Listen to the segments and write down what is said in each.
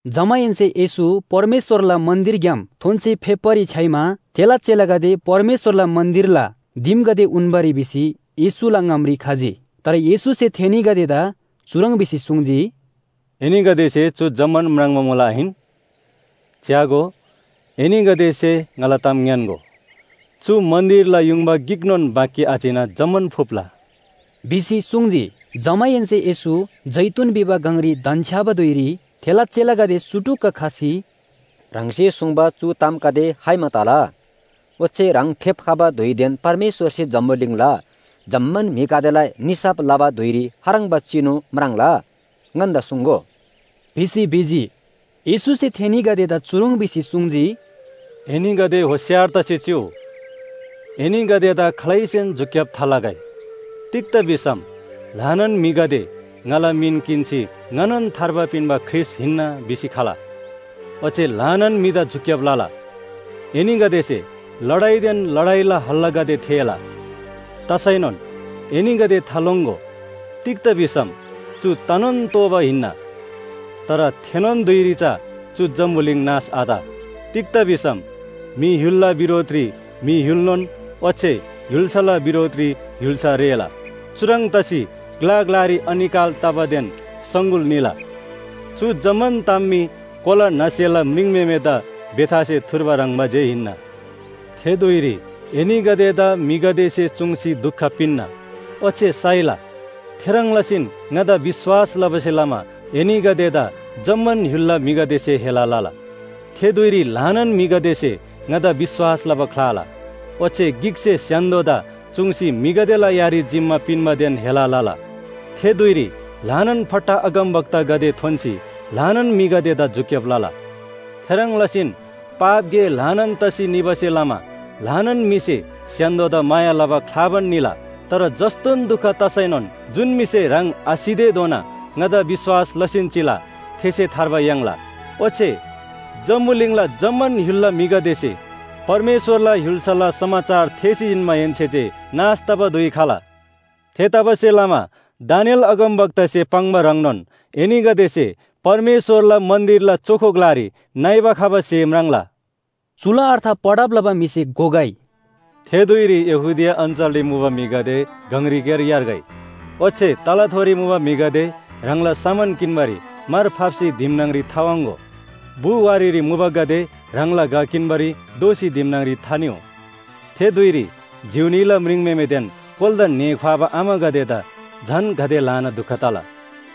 जमाहेन्‍से येशू परमेश्‍वरला मन्‍दिरग्‍याम थोन्‍सी फेप्‍बारी छ्‌याइमा थेला चेलागदे परमेश्‍वरला मन्‍दिरला दिमगदे उन्‍बारी भिसी येशूला ङामरी खजी। तर येशूसे थेनीगदेदा चुह्रङ् भिसी सुङ्जी, “एनीगदेसे चु जम्‍मान म्राङ्बा मुला आहिन? च्‍यागो, एनीगदेसे ङाला ताम ङ्‌यान्‍गो, चु मन्‍दिरला युङबा गिकनोन बाँकी आचिना जम्‍मान फुप्‍ला” भिसी सुङ्जी। जमाहेन्‍से येशू जैतून भिबा गङरी धन्‍छ्‌याबा धुइरी, थेला चेलागदे सुटुक्‍क खसी “ह्राङसे सुङ्बा चु तामगदे खाइमा तला? ओच्‍छे ह्राङ फेप्‍खबा धुइदेन परमेश्‍वरसे जम्‍बुलिङला जम्‍मान म्‍हिगदेला निसाफ लबा धुइरी खाह्रङ्बा चिनु म्राङ्ला? ङन्‍दा सुङ्‍गो” भिसी भिजी। येशूसे थेनीगदेदा चुह्रङ् भिसी सुङ्जी, “एनीगदे होशियार तसी चिउ, एनीगदेदा खालैसेन झुक्‍याब थालगै। तिग्‍दा भिसम ल्‍हानान म्‍हिगदे ङाला मिन किन्‍सी ‘ङानोन थार्बा पिन्‍बा ख्रीष्‍ट हिन्‍ना’ भिसी खला। ओच्‍छे ल्‍हानान म्‍हिदा झुक्‍याब लला। एनीगदेसे लडाइदेन लडाइला हल्‍लागदे थेःला। तसैनोन एनीगदे थालोङ्‍गो, तिग्‍दा भिसम चु तनोन तोःबा हिन्‍ना। तर थेनोन धुइरी चा चु जम्‍बुलिङ नाश आत। तिग्‍दा भिसम म्‍हि य्‍हुलला बिरोधरी म्‍हि य्‍हुलनोन ओच्‍छे य्‍हुल्‍साला बिरोधरी य्‍हुल्‍सा रेःला। चुह्रङ् तसी ग्‍ला ग्‍लारी अनिकाल तबादेन सङगुल निला। चु जम्‍मान ताम मी कोला न्‍हसेला म्रिङम्‍हेमेदा बेथासे थुर्बा ह्रङ्‌बा जे हिन्‍ना। “थे धुइरी एनीगदेदा म्‍हिगदेसे चुङ्सी दुख पिन्‍ना, ओच्‍छे साइला। थेह्रङ् लसीन ङादा विश्‍वास लबासे लमा एनीगदेदा जम्‍मान य्‍हुलला म्‍हिगदेसे हेला लला। थे धुइरी ल्‍हानान म्‍हिगदेसे ङादा विश्‍वास लबा ख्‍लाला। ओच्‍छे गिकसे स्‍य्‍हान्‍दोदा चुङ्सी म्‍हिगदेला यारी जिम्‍मा पिन्‍बादेन हेला लला। थे धुइरी ल्‍हानान फट्टा अगमवक्तागदे थोन्‍सी ल्‍हानान म्‍हिगदेदा झुक्‍याब लला। थेह्रङ् लसीन पाप गे ल्‍हानान तसी निबासे लमा ल्‍हानान म्‍हिसे स्‍य्‍हान्‍दोदा माया लबा ख्‍लाबान निला। तर जस्‍तोन दुख तसैनोन जुन म्‍हिसे ह्राङ आसितेधोना ङादा विश्‍वास लसीन चिला थेसे थार्बा याङ्ला। ओच्‍छे जम्‍बुलिङला जम्‍मान य्‍हुलला म्‍हिगदेसे परमेश्‍वरला य्‍हुल्‍साला समाचार थेःसी जिन्‍माहेन्‍से जे नाश तबा धुइ खला। “थेतबासेलमा दानिएल अगमवक्तासे पाङ्बा ह्रङ्नोन एनीगदेसे परमेश्‍वरला मन्‍दिरला चोखो ग्‍लारी नइबा खबा स्‍हे म्राङ्ला।” चुला अर्थ पढब लबा म्‍हिसे घोगै। “थे धुइरी यहूदिया अञ्‍चलरी मुबा म्‍हिगदे गङरीक्‍यार यार्गै। ओच्‍छे तलाथोरी मुबा म्‍हिगदे ह्राङला सामान किन्‍बारी मार फाप्‍सी दिम न्‍हङरी थावाङ्‍गो। बु वारीरी मुबागदे ह्राङला घ किन्‍बारी दोःसी दिमरी थानिउ। थे धुइरी जिउ न्‍हीला म्रिङम्‍हेमेदेन कोलादा ङ्‍हे ख्‍वाबा आमागदेदा झन गाते ल्‍हानान दुख तला!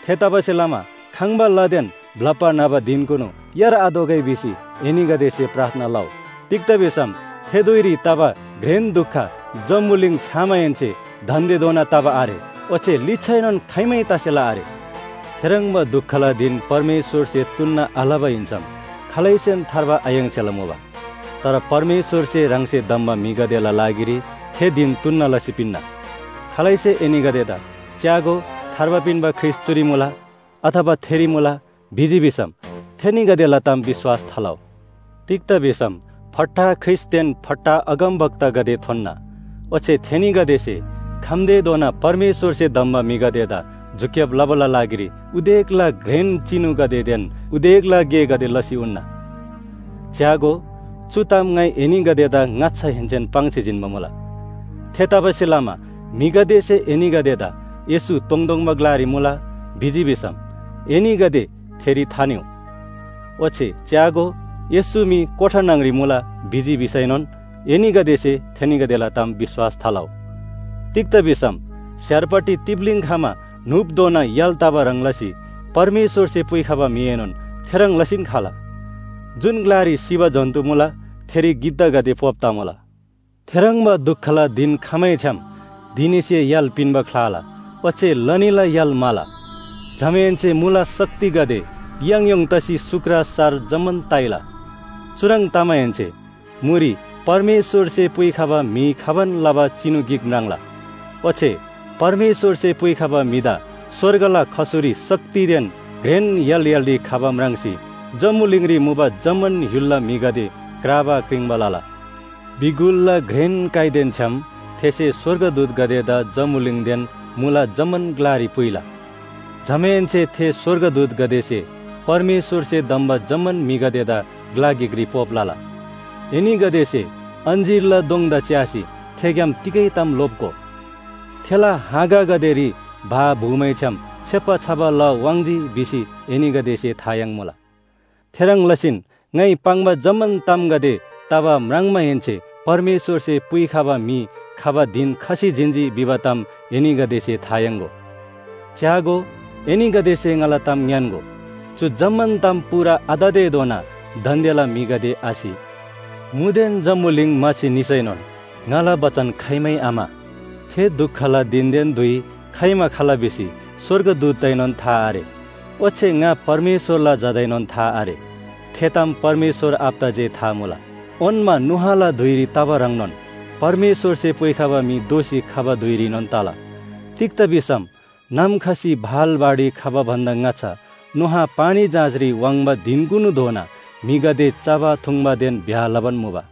थेतबासेलमा खङ्‍बा लादेन ब्‍लप्‍बा न्‍हबा धिनकुनु यारआतोःगै भिसी एनीगदेसे प्रार्थना लउ। तिग्‍दा भिसम थे धुइरी तबा घ्रेन दुख जम्‍बुलिङ छ्‌यामाहेन्‍से दान्‍देधोना तबा आरे ओच्‍छे लिच्‍छाएनोन खाइमै तसेला आरे। थेह्रङ्बा दुखला धिन परमेश्‍वरसे तुन्‍ना आलबा हिन्‍सम खालैसेन थार्बा आयाङ्सेला मुबा। तर परमेश्‍वरसे ह्राङसे धम्‍बा म्‍हिगदेला लागिरी थे धिन तुन्‍ना लसी पिन्‍ना। “खालैसे एनीगदेदा ‘च्‍यागो, थार्बा पिन्‍बा ख्रीष्‍ट चुरी मुला,’ अथवा ‘थेरी मुला,’ भिजी भिसम थेनीगदेला ताम विश्‍वास थालउ। तिग्‍दा भिसम फट्टा ख्रीष्‍टगदेदेन फट्टा अगमवक्तागदे थोन्‍ना। ओच्‍छे थेनीगदेसे खम्‍तेधोना परमेश्‍वरसे धम्‍बा म्‍हिगदेदा झुक्‍याब लबाला लागिरी उदेकला घ्रेन चिनुगदेदेन उदेकला गेगदे लसी उन्‍ना। च्‍यागो, चु ताम ङाइ एनीगदेदा ङाच्‍छाहेन्‍सेन पाङ्सी पिन्‍बा मुला। “थेतबासेलमा म्‍हिगदेसे एनीगदेदा ‘येशू तोङतोङबा ग्‍लारी मुला’ भिजी भिसम, एनीगदे थेरी थानिउ। ओच्‍छे ‘च्‍यागो, येशू मी कोठा न्‍हङ‍री मुला’ भिजी भिसैनोन एनीगदेसे थेनीगदेला ताम विश्‍वास थालउ। तिग्‍दा भिसम स्‍यारपट्टि तिप्‍लीङ खमा न्‍हुपधोना य्‍हाल तबा ह्रङ् लसी परमेश्‍वरसे पुइखबा म्‍हिएनोन थेह्रङ् लसीन खला। “जुन ग्‍लारी सिबा जन्‍तु मुला थेरी गिद्धागदे पोप तमुला। “थेह्रङ्बा दुखला धिन खमैछ्‌याम, ‘धिनीसे य्‍हाल पिन्‍बा ख्‍लाला ओच्‍छे लनीला य्‍हाल म्‍हाला। जमाहेन्‍से मुला शक्तिगदे याङयोङ तसी सुक्र सार जम्‍मान ताइला।’ चुह्रङ् तमाहेन्‍से मुरी परमेश्‍वरसे पुइखबा म्‍हि खबान लबा चिनु गिक म्राङ्ला। ओच्‍छे परमेश्‍वरसे पुइखबा म्‍हिदा स्‍वर्गला खसुरी शक्तिदेन घ्रेन य्‍हाल य्‍हालरी खबा म्राङ्सी जम्‍बुलिङरी मुबा जम्‍मान य्‍हुलला म्‍हिगदे क्राबा क्रिङ्बा लला। बिगुलला घ्रेन काइदेन छ्‌याम थेसे स्‍वर्गदूतगदेदा जम्‍बुलिङदेन मुला जम्‍मान ग्‍लारी पुइला। जमाहेन्‍से थे स्‍वर्गदूतगदेसे परमेश्‍वरसे धम्‍बा जम्‍मान म्‍हिगदेदा ग्‍ला गिकरी पोप लला। “एनीगदेसे अञ्‍जीरला दोङदा च्‍यासी थेग्‍याम तिगै ताम लोप्‍गो। थेला हाँगागदेरी भा भुमैछ्‌याम छेप्‍बा छबा ला वाङ्‌जी भिसी एनीगदेसे था याङ्मुला। थेह्रङ् लसीन ङाइ पाङ्बा जम्‍मान तामगदे तबा म्राङ्माहेन्‍से परमेश्‍वरसे पुइखबा म्‍हि खबा धिन खसी जिन्‍जी भिबा ताम एनीगदेसे था याङ्‍गो। च्‍यागो, एनीगदेसे ङाला ताम ङ्‌यान्‍गो, चु जम्‍मान ताम पूरा आततेधोना दान्‍देला म्‍हिगदे आसि। मुदेन जम्‍बुलिङ म्‍हासी निसैनोन ङाला बचन खाइमै आम्‍हा। “थे दुखला धिनदेन धुइ खाइमा खला भिसी स्‍वर्गदूतदाएनोन था आरे ओच्‍छे ङा परमेश्‍वरला झादाएनोन था आरे। थे ताम परमेश्‍वर आबादा जे था मुला। ओन्‍मा नोआला धुइरी तबा ह्रङ्नोन परमेश्‍वरसे पुइखबा म्‍हि दोःसी खबा धुइरीनोन तला। तिग्‍दा भिसम नाम खसी भाल बाढी खबा भन्‍दा ङाच्‍छा नोआ पानी जहाजरी वाङ्बा धिनकुनुधोना म्‍हिगदे चबा थुङ्बादेन ब्‍याह लबान मुबा।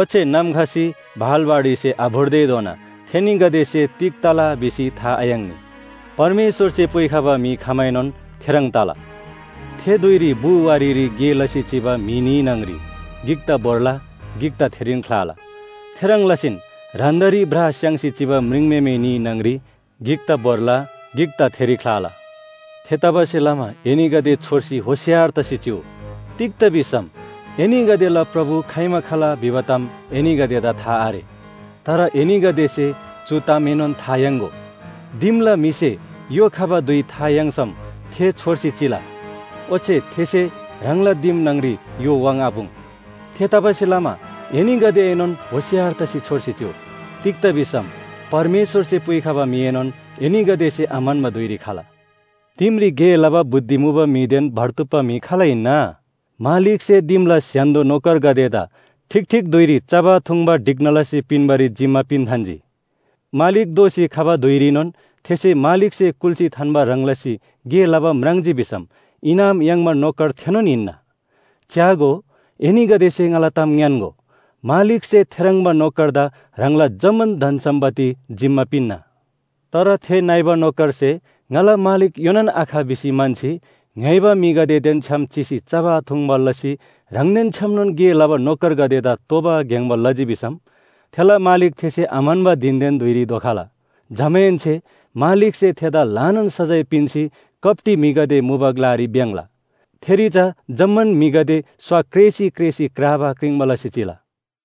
ओच्‍छे नाम खसी भाल बाढीसे आभोर्तेधोना थेनीगदेसे तिग तला भिसी था आयाङ्नी। परमेश्‍वरसे पुइखबा म्‍हि खमाएनोन थेह्रङ् तला। थे धुइरी बु वारीरी गे लसी चिबा म्‍हि न्‍ही न्‍हङ‍री गिकदा भोर्ला गिकदा थेरीन ख्‍लाला। थेह्रङ् लसीन ह्रान्‍दारी ब्रा स्‍याङ्सी चिबा म्रिङम्‍हेमे न्‍ही न्‍हङ‍री गिकदा भोर्ला, गिकदा थेरी ख्‍लाला। “थेतबासेलमा एनीगदे होशियार तसी छोर्सी चिउ। तिग्‍दा भिसम एनीगदेला प्रभु खाइमा खला भिबा ताम एनीगदेदा था आरे। तर एनीगदेसे चु तामएनोन था याङ्‍गो, दिमला म्‍हिसे य्‍हो खबा धुइ था याङ्सम थे छोर्सी चिला, ओच्‍छे थेसे ह्राङला दिम न्‍हङरी य्‍हो वाङ्आपुङ्। थेतबासेलमा एनीगदेएनोन होशियार तसी छोर्सी चिउ। तिग्‍दा भिसम परमेश्‍वरसे पुइखबा म्‍हिएनोन एनीगदेसे आम्‍हन्‍बा धुइरी खला। “दिमरी गे लबा बुद्धि मुबादेन भर्तुप्‍पा म्‍हि खाल हिन्‍ना? मालिकसे दिमला स्‍य्‍हान्‍दो नोकरगदेदा ठीक ठीक धुइरी चबा थुङ्बा ढिक्‍ना लसी पिन्‍बारी जिम्‍मा पिन्‍थान्‍जी।” मालिक दोःसी खबा धुइरीनोन थेसे मालिकसे कुल्‍सी थान्‍बा ह्रङ् लसी गे लबा म्राङ्जी भिसम इनाम याङ्बा नोकर थेनोन हिन्‍ना। च्‍यागो, एनीगदेसे ङाला ताम ङ्‌यान्‍गो, मालिकसे थेह्रङ्बा नोकरदा ह्राङला जम्‍मान धन सम्‍पत्ति जिम्‍मा पिन्‍ना। तर थे नइबा नोकरसे ‘ङाला मालिक योनान आख’ भिसी म्‍हन्‍सी, ङ्‍य्‍होइबा म्‍हिगदेदेन छ्‌याम चिसी चबा थुङ्बा लसी ह्राङदेन छ्‌यामनोन गे लबा नोकरगदेदा तोबा ग्‍याङ्‍बा लजी भिसम, थेला मालिक थेसे आम्‍हन्‍बा धिनदेन धुइरी धोखला। जमाहेन्‍से मालिकसे थेदा ल्‍हानान सजाय पिन्‍सी कप्‍टी म्‍हिगदे मुबा ग्‍लारी भ्‍याङ्‍ला। थेरी चा जम्‍मान म्‍हिगदे स्‍वा क्रेसी क्रेसी क्राबा क्रिङ्बा लसी चिला।”